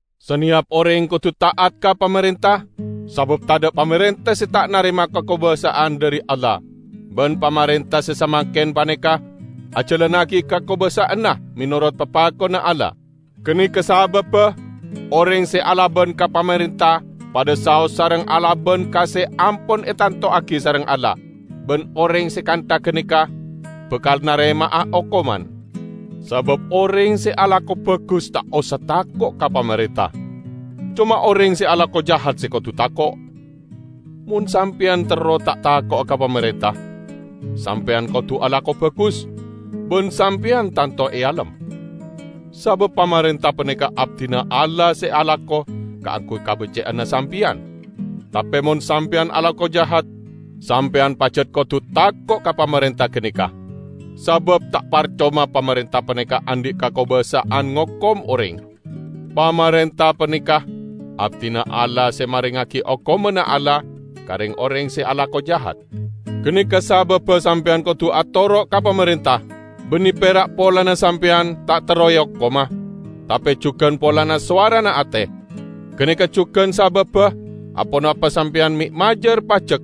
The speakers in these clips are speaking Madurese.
Saneyap oreng kodu ta'at ka pamarenta, sabab tadha' pamarenta se ta' narema kakobasa'an dhari Allah. Ban pamarenta se samangken paneka ajalannagi kakobasa'anna menorot papakonna Allah. Ganeka sababba oreng se alaban ka pamarenta padha saos sareng alaban ka se ampon etantowagi sareng Allah. Ban oreng se kantha ganeka bakal narema'a okoman. Sabab oreng se alako bagus ta' osa tako' ka pamarenta. Coma oreng se alako jahat se kodu tako'. Mon sampeyan terro ta' tako'a ka pamarenta, sampeyan kodu alako bagus, ban Sampeyan tanto ealem. Sabab pamarenta paneka abdina Allah se alako kaangguy kabecce'anna sampeyan. Tape mon sampeyan alako jahat, sampeyan pajat kodu tako' ka pamarenta ganeka, sabab ta' parcoma pamarenta paneka andhi' kakobasa'an ngokom oreng. Pamarenta paneka abdina Allah se marengngagi okomanna Allah ka reng-oreng se alako jahat. Ganeka sababba sampeyan kodu atoro' ka pamarenta -- banne pera' polana sampeyan ta' terro eokoma, tape jugan polana sowarana ate. Ganeka jugan sababba aponapa sampeyan me' majar pajek,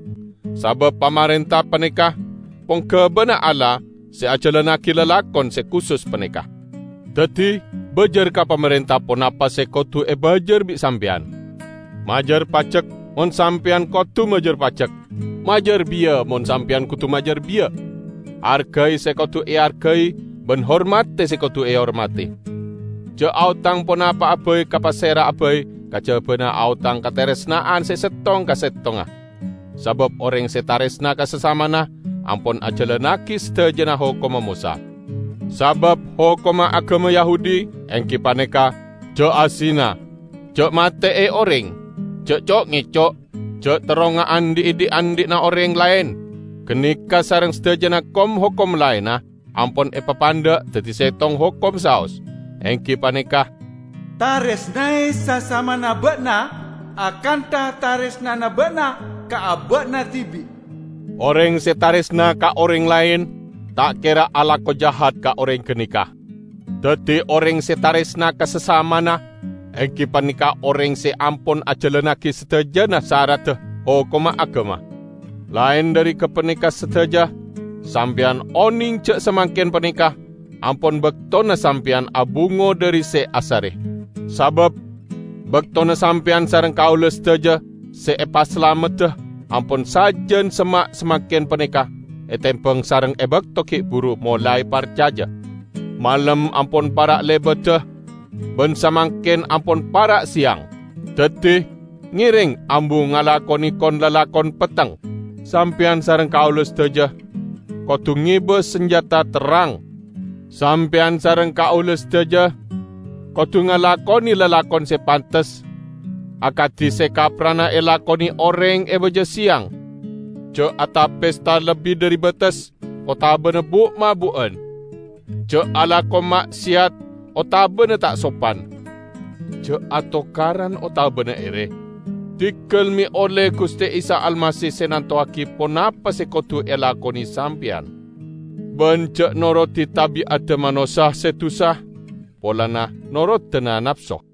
sabab pamarenta paneka ponggabana Allah se ajalannagi lalakon se kusus paneka. Daddi, bajar ka pamarenta ponapa se kodu ebajar bi' sampeyan. Majar pajek, mon sampeyan kodu majar pajek; majar biya mon sampeyan kodu majar biya. Argai se kodu eargai ban hormadi se kodu ehormadi. Ja' aotang ponapa'a bai ka pasera'a bai kajabana aotang kataresna'an se settong ka settongnga. Sabab oreng se taresna ka sasamana ampon ajalannagi sadajana hokomma Mosa. Sabab hokomma agama Yahudi, enggi paneka: Ja' azina, ja' mate'e oreng, ja' co'-ngeco', ja' terro ngaandhi'a dhi'-andhi'na oreng laen, ganeka sareng sadajana kom-hokom laenna, ampon epapandha' daddi settong hokom saos, enggi paneka, "Taresnae sasamana ba'na akantha taresnana ba'na ka aba'na dibi'." Oreng se taresna ka oreng laen, ta' kera alako jahat ka oreng ganeka. Daddi oreng se taresna ka sasamana enggi paneka oreng se ampon ajalannagi sadajana saradda hokomma agama. Laen dhari gapaneka sadaja, sampeyan oneng ja' samangken paneka ampon baktona sampeyan abungo dhari se asare. Sabab baktona sampeyan sareng kaula sadaja se epasalamedda ampon sajan semma' samangken paneka etembang sareng e bakto gi' buru molae parcaja. Malem ampon para' lebada, ban samangken ampon para' seyang. Daddi, ngereng ambu ngalakone kon-lalakon petteng. Sampeyan sareng kaula sadaja kodu ngeba sanjata terrang. Sampeyan sareng kaula sadaja kodu ngalakone lalakon se pantes akadi se kapprana elakone oreng e baja seyang; ja' ata-pesta lebbi dhari bates, otabana bu'-mabu'an. Ja' alako ma'seyat otabana ta' sopan. Ja' atokaran otabana ere. Diggal me' olle Guste Isa Almasih se nantowagi ponapa se kodu elakone sampeyan. Ban ja' norodi tabi'adda manossa se dusa polana norodana napso.